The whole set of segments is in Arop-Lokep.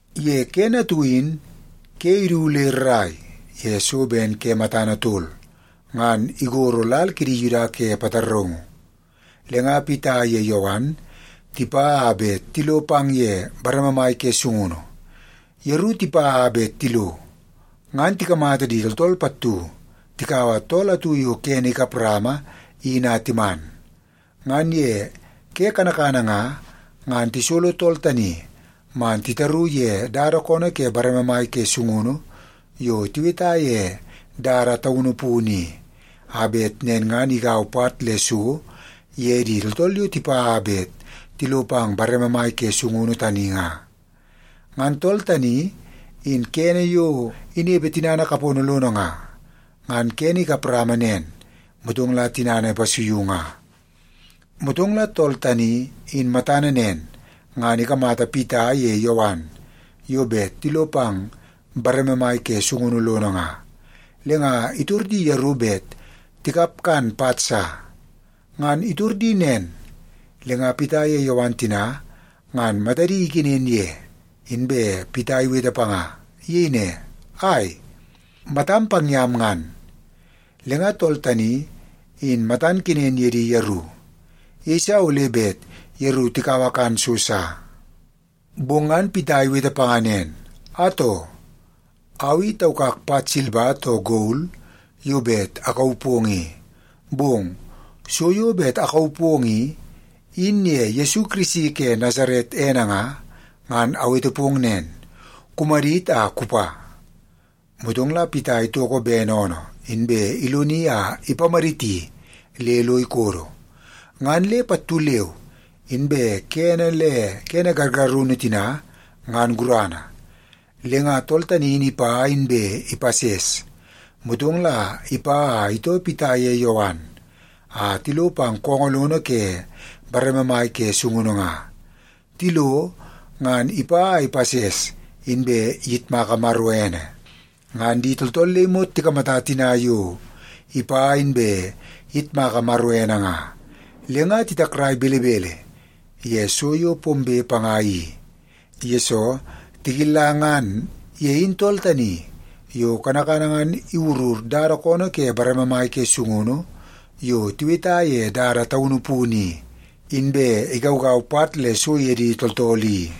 Ye kene atu in ke idu le rrai ye so ben ke matana tol, ngan igoro lal kidi Yuda ke pataraungu. Le nga Pita ye Yowan tipa a bet tilo pang ye bareme mai ke sungunu. Yeru tipa a bet tilo, ngan tikamata di tooltool pattu takaua tool atu yo kene ikap rama in a timan. Ngan ye ke kanakana nga, ngan tisolo tool tani man titaru ye dada koonoo ke bareme mai ke sungunu yo tiweta ye Dada Taunu Punu i, a bet nen igau pat le so ye di tooltool yo tipa a bet tilo pang ye bareme mai ke sungunu tani nga. Ngan tool in kene yo inepe tinana kapono lono nga, ngan kene ikap rama nen, motong la tinana ipasuiu nga. Motong la tool tani in matana nen, ngan ikamata Pita ye Yowan yo bet tilo pang bareme mai ke sungunu lono nga, le nga itor di yeru bet tikap kan pat sa. Ngan itor nen, le nga Pita ye Yowan tina ngan matadi ikenen ye, inbe Pita iwete panga. Iyei ne, “Ai! Matam pang yam ngan!” Le nga tool tani in matan kenen ye di yeru. Iyeisa ole bet yeru tikaua kan so sa. Bong ngan Pita iwete panga nen, “Atoo! Au i taukak pat silba too gol yo bet akauu pong i, bong so yo bet akauu pong i, in ye Yesu Kirisi ke Nasaret ene nga, ngan awete pong nen, kumadit a kupa.” Motong la Pita itoko bene oonoo, inbe iloni a ipamaditi le lo ikodo. Ngan le pattu leu inbe kene le kene gargarunu tina ngan gurana. Le nga tool tani in ipa inbe ipases. Motong la ipa a itoo Pita ye Yowan a tilo pang koongoo lono ke bareme mai ke sungunu nga. Tilo, ngan ipa a ipases, inbe iyitmaka Maro ene. Ngan di tooltool le imot tikamata tina yo ipa inbe iyitmaka Maro ene nga, le nga titakrai belebele ye so yo pombe panga i, yesoo tikilla ngan ye in tool tani yo kanakana ngan iwurur dada koonoo ke bareme mai ke sungunu yo tiweta ye Dada Taunu Punu i, inbe igaugau pat le so ye di tooltool i.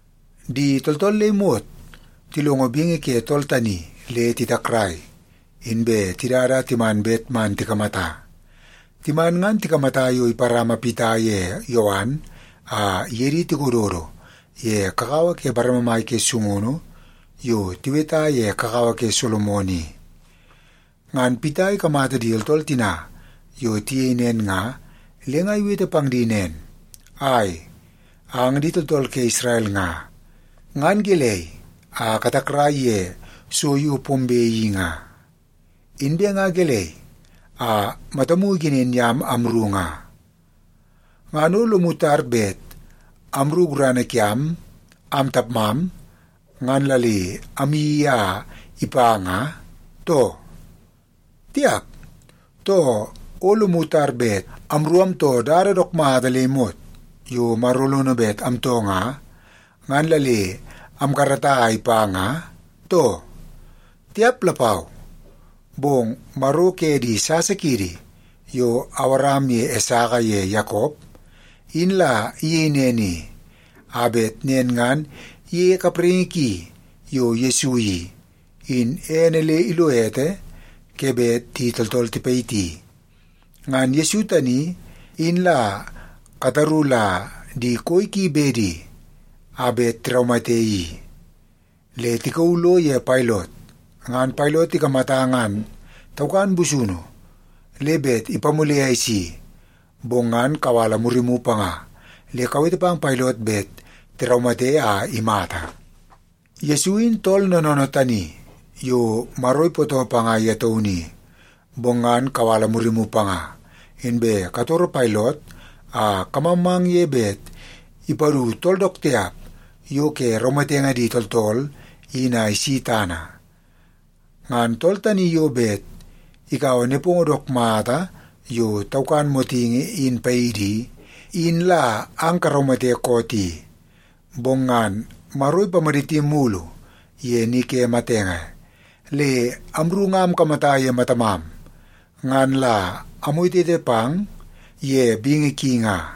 Di tooltool le imot tilongo bingi ke tool tani le titakrai, inbe tidada a timan bet man tikamata. Timan ngan tikamata yo iparama Pita ye Yowan a iye di tikododo ye kakawa ke bareme mai ke sungunu yo tiweta ye Kakawa ke Solomon i. Ngan Pita ikamata di tooltool tina yo tiyei nen nga, le nga iwete pang di nen, “Ai, ang di tooltool ke Isrel nga, ngan gelei a katakrai ye so yo pombe i nga? Inbe nga gelei a matamu ikenen yam amru nga? Ngan o lomu tar bet amru gurana kiam am tapmam, ngan la le amyeii a ipa nga, too? Tiap! Too, o lomu tar bet amru amtoo dada dook mata le imot yo Maro lono bet amtoo nga, ngan la le amkarata a ipa nga, too? Tiap lapau! Bong Maro ke di sasa kiidi yo Awaram ye Esaka ye Yakop, in la iyei nen i, a bet nen ngan iyeie kapraingi ki yo Yesu i, in ene le ilo ete ke bet di tooltool tipayiti. Ngan Yesu tani, in la kataru la di koi ki bedi a bet tiraumate i. Le tikauu lo ye Pailot, ngan Pailot ikamata ngan taukan busunu le bet ipamule a isi, bong ngan kawala murimu panga le kawete pang Pailot bet tiraumate a imata. Yesu in tool noonoonoo tani yo Maro ipootoo panga ye taunu i, bong ngan kawala murimu panga, inbe katoro Pailot a kamangmang ye bet ipadu tool dook tiap yo ke raumatenge di tooltool in a isi tana. Ngan tool tani yo bet ikaua nepongo dook mata yo taukan motingi in paidi i, in la ang karaumate koot i. Bong ngan Maro ipamaditi mulu ye ni ke matenge. Le amru nga amkamata ye matamam ngan la amwetewete pang ye bingi ki nga.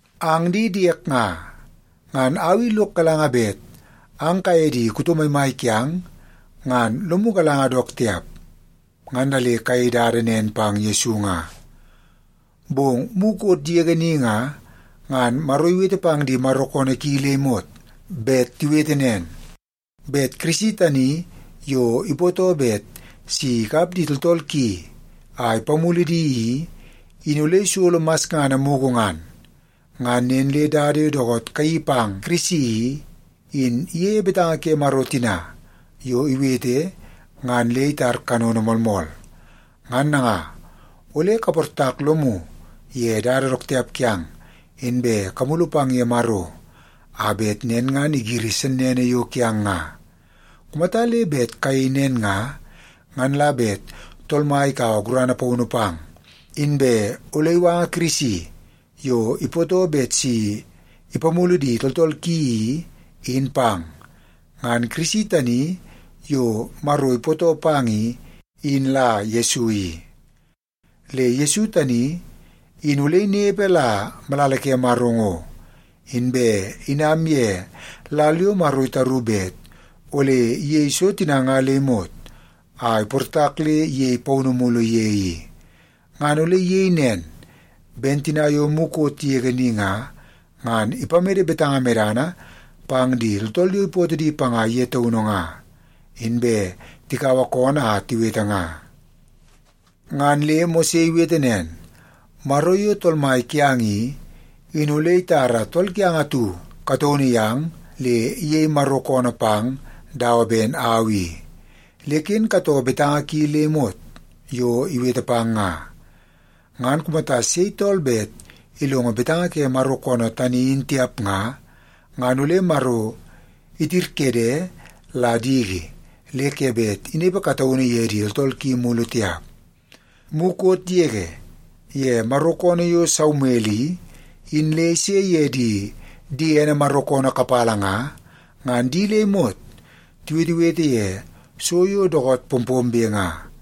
“Ang di diek nga, ngan au i lok galanga bet ang kaye di kuto maimai kiang, ngan lomu galanga dook tiap, ngan la le kayei dada nen pang Yesu nga. Bong mukot yege ni nga, ngan Maro iwete pang di Maro koonoo ki le imot bet tiwete nen, bet Kirisi tani yo ipootoo bet si ikap di tooltool ki a ipamulu di i, in ole isolo masngana mugu ngan. Ngan nen le dada yo dookoot kayeii pang Kirisi i, in iyei betanga ke Maro tina yo iwete ngan le itar kanono moolmool. Ngan nanga, ole kaportak lomu ye dada dook tiap kiang, inbe kamulu pang ye Maro, a bet nen ngan igiri sennene yo kiang nga. Kumata le bet kayei nen nga, ngan la bet Tool Mai ikaua gurana paunu pang, inbe ole iwanga Kirisi yo ipootoo bet si ipamulu di tooltool ki i, in pang. Ngan Kirisi tani yo Maro ipootoo pang i, in la Yesu i. Le Yesu tani in ole inepe la malala ke Maro ngo, inbe inam ye lal yo Maro itaru bet ole iyei so tina nga le imot a iportak le iyei paunu mulu ye i. Ngan ole iyei nen ben tina yo mukot yege ni nga, ngan ipamede betanga medana pang di tooltool yo ipootoo di panga ye taunu nga, inbe tikaua koonoo a tiwete nga. Ngan le Mose iwete nen, ‘Maro yo Tool Mai kiang i, in ole itara tool kiang atu kataunu yang le iyei Maro koonoo pang dawa ben au i. Le ken katoo betanga ki le imot yo iwete pang nga. Ngan kumata sei tool bet ilongo betanga ke Maro koonoo tani in tiap nga, ngan ole Maro itirkede la diki le ke bet inepe kataunu ye di tooltool ki mulu tiap.’ “Mukot yege ye Maro koonoo yo Saumel i, in le ise ye di diene Maro koonoo kapala nga, ngan di le imot tiwetewete ye so yo dookoot pompombe nga.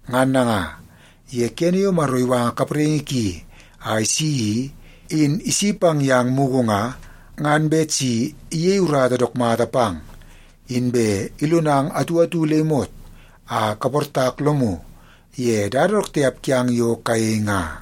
Ngan nanga, ye kene yo Maro iwanga kapraingi ki a isi i, in isi pang yang mugu nga, ngan bet si iyei urata dook mata pang, inbe ilonang atu atu le imot a kaportak lomu ye dada dook tiap kiang yo kayei nga.”